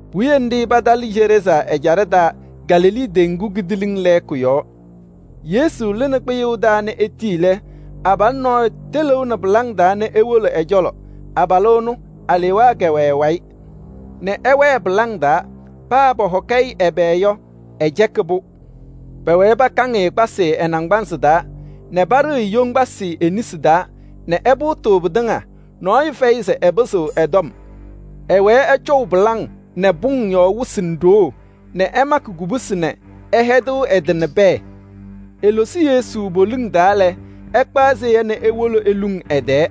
Puwiye nɖɩ patalɩ Geraazaa ɛjaɖɛ taa Galilee teŋgu kidiiliŋ lɛɛkʋ yɔɔ. Yesu lɩnɩ kpɩyʋʋ taa nɛ etii lɛ, abalʋ nɔɔyʋ tɩlɩʋnɩ pɩlaŋ taa nɛ ewolo ɛ-cɔlɔ. Abalʋ ɛnʋ, alewaa kɛwɛ ɛ-wayɩ nɛ ɛwɛɛ pɩlaŋ taa, paa paahɔkɩ-ɩ ɛbɛ yɔ, ɛcɛkɩ-pʋ. Pɛwɛɛ pakaŋ-ɩ kpasɩ ɛ-naŋgbanzɩ taa nɛ paɖɩɣ yoŋgbasɩ e-nesi taa nɛ ɛpʋʋtɩ pɩtɩŋa. Nɔɔyʋ fɛyɩ se ɛpɩzɩɣ ɛ-tɔm. Ɛwɛɛ ɛcɔʋ pɩlaŋ nɛ pʋŋ pɔ-yɔɔ wɩsɩ nɛ ɖoo nɛ ɛmakɩ kubusi nɛ ɛhɛdɩɣ ɛ-tɩ nɛ pɛɛ. Elosi Yesu poliŋ taa lɛ, ɛkpaɣ seya nɛ ewolo eluŋ ɛ-tɛɛ.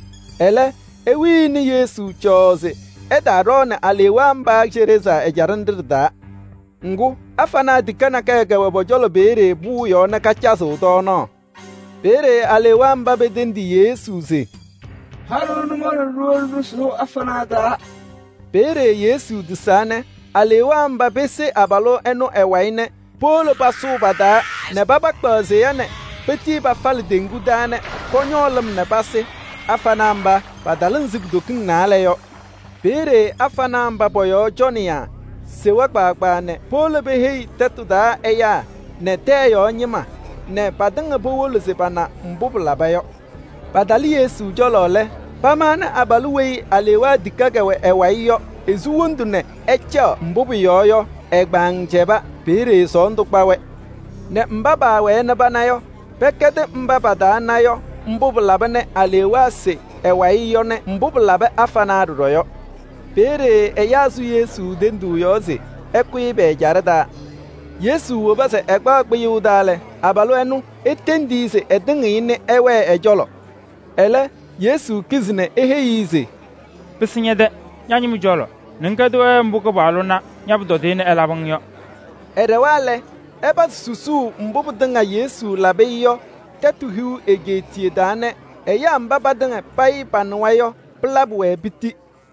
Ɛlɛ, pewini Yesu cɔɔɔ se ɛtaaɖɔɔnɩ-wɛ Geraazaa ɛjaɖɛ nɖɩ ɖɩ-taa. Ŋgʋ, afanaa tikaɣ nakɛyɛ kɛwɛ pɔ-cɔlɔ peeye pʋʋ yɔɔ nɛ kacazɩɣ tɔɔnaɣ. Peeye alewaa mba petendi Yesu se: “Ha-ɖʋ nʋmɔʋ nɛ ɖiwolo ɖɩsʋʋ afanaa taa.” Peeye Yesu tisaa nɛ alewaa mba pese abalʋ ɛnʋ ɛ-wayɩ nɛ powolo pasʋʋ pa-taa nɛ paba kpaɣ seya nɛ petii pafalɩ teŋgu taa nɛ pɔñɔɔ lɩm nɛ pasɩ. Afanaa mba, patalɩ ɛzɩ kutokiŋ naalɛ yɔ. Peeye afanaa mba pɔ-yɔɔ cɔnɩyaa sewa kpaagbaa nɛ powolo peheyi tɛtʋ taa ɛyaa nɛ tɛyɛ yɔɔ ñɩma nɛ patɩŋa powolo se pana mbʋ pɩlaba yɔ. Patalɩ Yesu cɔlɔ lɛ, pamaɣnɩ abalʋ weyi alewaa tikaɣ kɛwɛ ɛ-wayɩ yɔ, esu wondu nɛ ɛcaɣ. Mbʋ pʋyɔɔ yɔ, ɛ-kpaŋ cɛba. Peeye sɔɔndʋ kpa-wɛ nɛ mba paawɛɛ nɛ pana yɔ, pɛkɛdɩ mba patana yɔ mbʋ pɩlaba nɛ alewaa se ɛ-wayɩ yɔ nɛ mbʋ pɩlabɩ afanaa ɖɔɖɔ yɔ. Peeye ɛyaa sʋ Yesu tenduu yɔɔ se ɛkʋyɩ pɛ-ɛjaɖɛ taa. Yesu woba se ɛkpaɣ kpɩyʋʋ taa lɛ, abalʋ ɛnʋ etendi-i se ɛtɩŋɩɣ-ɩ nɛ ɛwɛɛ ɛ-cɔlɔ. Ɛlɛ, Yesu kizi nɛ eheyi-i se: “Pɩsɩ ñɛ-tɛ ña-ñɩma cɔlɔ nɛ ŋkɛdɩ-wɛ mbʋ Kɩpaɣlʋ na ña-pʋtɔdɩyɛ nɛ ɛlabɩ-ŋ yɔ.” Ɛɖɛwa lɛ, ɛpazɩ susuu mbʋ pɩtɩŋa Yesu labɩ-ɩ yɔ Tɛtʋ Hiu Egeetiye taa nɛ ɛyaa mba patɩŋa payɩ panɩwa yɔ, pɩlabɩ-wɛ piti.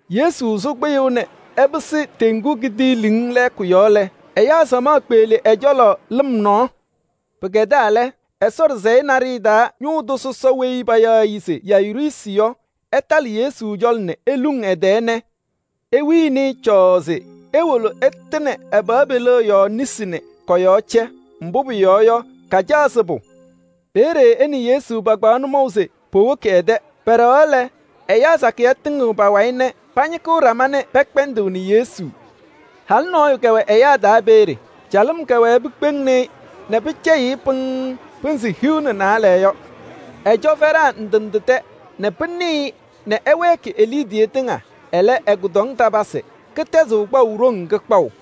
Yesu sʋ kpɩyʋʋ nɛ ɛpɩsɩ teŋgu kidiiliŋ lɛɛkʋ yɔɔ lɛ, ɛyaa samaɣ kpeɣli ɛ-cɔlɔ lɩm nɔɔ. Pɩkɛdaa lɛ, Ɛsɔ ɖɩsɛyɛ naɖɩyɛ taa ñʋʋ tʋ sɔsɔ weyi payaɣ se Yayiruusi yɔ, ɛtalɩ Yesu cɔlɔ nɛ eluŋ ɛ-tɛɛ nɛ ewini-i cɔɔɔ se ewolo ɛtɩnɩ ɛ-pɩɣa peliɣa yɔɔ nesi nɛ kɔ-yɔɔ cɛ. Mbʋ pʋyɔɔ yɔ, kacaɣ sɩbʋ. Peeye ɛ nɛ Yesu pakpaɣ nʋmɔʋ se powoki ɛ-tɛ. Pɛɖɛɣaɣ lɛ, ɛyaa sakɩyɛ tɩŋɩɣ pa-wayɩ nɛ pañɩkɩɣ ɖama nɛ pɛkpɛndɩɣnɩ Yesu. Halʋ nɔɔyʋ kɛwɛ ɛyaa taa peeye. Calɩm kɛwɛɛ pikpeŋni-i nɛ pɩcɛyɩɣ-ɩ pɩŋŋ pɩnzɩ hiu nɛ naalɛ yɔ. Ɛcɔ fɛɖaa ndɩ ndɩ tɛ nɛ pɩnɩ-ɩ nɛ ɛwɛɛkɩ e-liidiye tɩŋa. Ɛlɛ, ɛ-kʋdɔŋ tatɩɩpasɩ, kɩtɛzaɣ kɩtɛzʋ.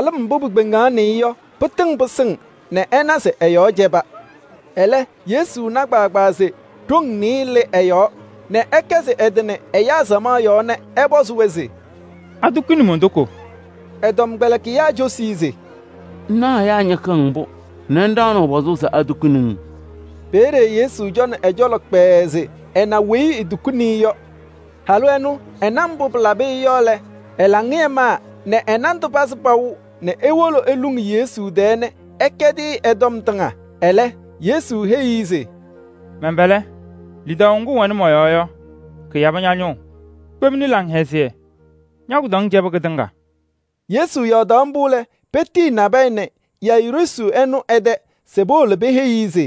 nɛ calɩm mbʋ pikpeŋaɣnɩ-ɩ yɔ, pɩtɩŋnɩ sɩŋʋʋ nɛ ɛna se ɛ-yɔɔ cɛba. Ɛlɛ, Yesu tɩnaʋ se ɖoŋ nɩɩyɩ lɩ ɛ-yɔɔ nɛ ɛkɛzɩ ɛ-tɩ nɛ ɛyaa samaɣ yɔɔ nɛ ɛpɔzɩ-wɛ se: “Atukuni mon-toko?” Ɛ-tɔmkpɛlɩkɩyaa cosi-i se: “Ŋnaɣ ɛyaa ñɩkɩɣ-ŋ mbʋ nɛ ŋɖaɣnɩɣ pɔzʋʋ se atukuni-ŋ?” Peeye Yesu cɔnɩ ɛ-cɔlɔ kpɛɛɛ se ɛna weyi etukuni-i yɔ. Halʋ ɛnʋ ɛna mbʋ pɩlabɩ-ɩ yɔ lɛ, ɛ-laŋɩyɛ maa nɛ ɛ-nandʋ pazɩ paʋ nɛ ewolo eluŋ Yesu tɛɛ nɛ ɛkɛdɩ-ɩ ɛ-tɔm tɩŋa. Ɛlɛ, Yesu heyi-i se: “Mɛn-pɛlɛ! Lidaʋ ŋgʋ ŋwɛnɩ mɔ-yɔɔ yɔ, kɩyabɩ ña-ñʋʋ. Kpemni laŋhɛzɩyɛ, ña-kʋdɔŋ cɛbɩ kɩtɩŋa.” Yesu yɔɔdaɣ mbʋ lɛ, petiyi nabɛyɛ nɛ Yayiruusi ɛnʋ ɛ-tɛ se powolo peheyi-i se: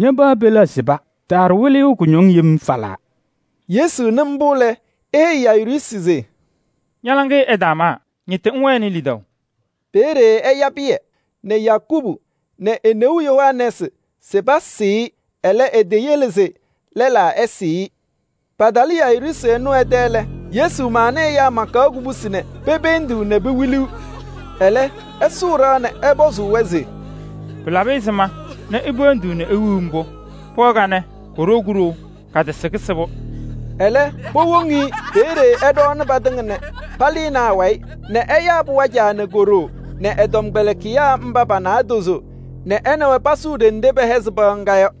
“Ña-pɩɣa peliɣa sɩba, taaɖʋ Wɩlɩyʋ kʋñɔŋ yem falaa.” Yesu nɩ mbʋ lɛ, eheyi Yayiruusi se: “Ña-laŋɩyɛ ɛtaamaa, ñɩtɩ ŋwɛnɩ lidaʋ.” Peeye ɛya Pɩyɛ nɛ Yakubu nɛ e-neu Yohanɛɛsɩ se pasɩɩ-ɩ. Ɛlɛ, eteyele se lɛlaa ɛsɩɩ-ɩ. Patalɩ Yayiruusi ɛnʋ ɛ-tɛ lɛ, Yesu maɣnɩ ɛyaa makaɣ kubusi nɛ pependiɣ nɛ pewiliɣ. Ɛlɛ, ɛsʋʋ ɖɩɣa nɛ ɛpɔzɩ-wɛ se: “Pɩlabɩ ɛzɩma nɛ ipeendiɣ nɛ iwiɣ mbʋ? Pɩɣa kanɛ koɖou kuɖou, katasɩ kɩsɩbʋ.” Ɛlɛ, powoŋ-i. Peeye ɛɖɔɔnɩ patɩŋa nɛ palɩnɩ awayɩ nɛ ɛyaa pɩɣa caa nɛ ko-ɖoo nɛ ɛ-tɔmkpɛlɩkɩyaa mba pa-naadozo nɛ ɛ nɛ wɛ pasʋʋ ɖenɖe pɛhɛzɩ pɩɣa ŋga yɔ.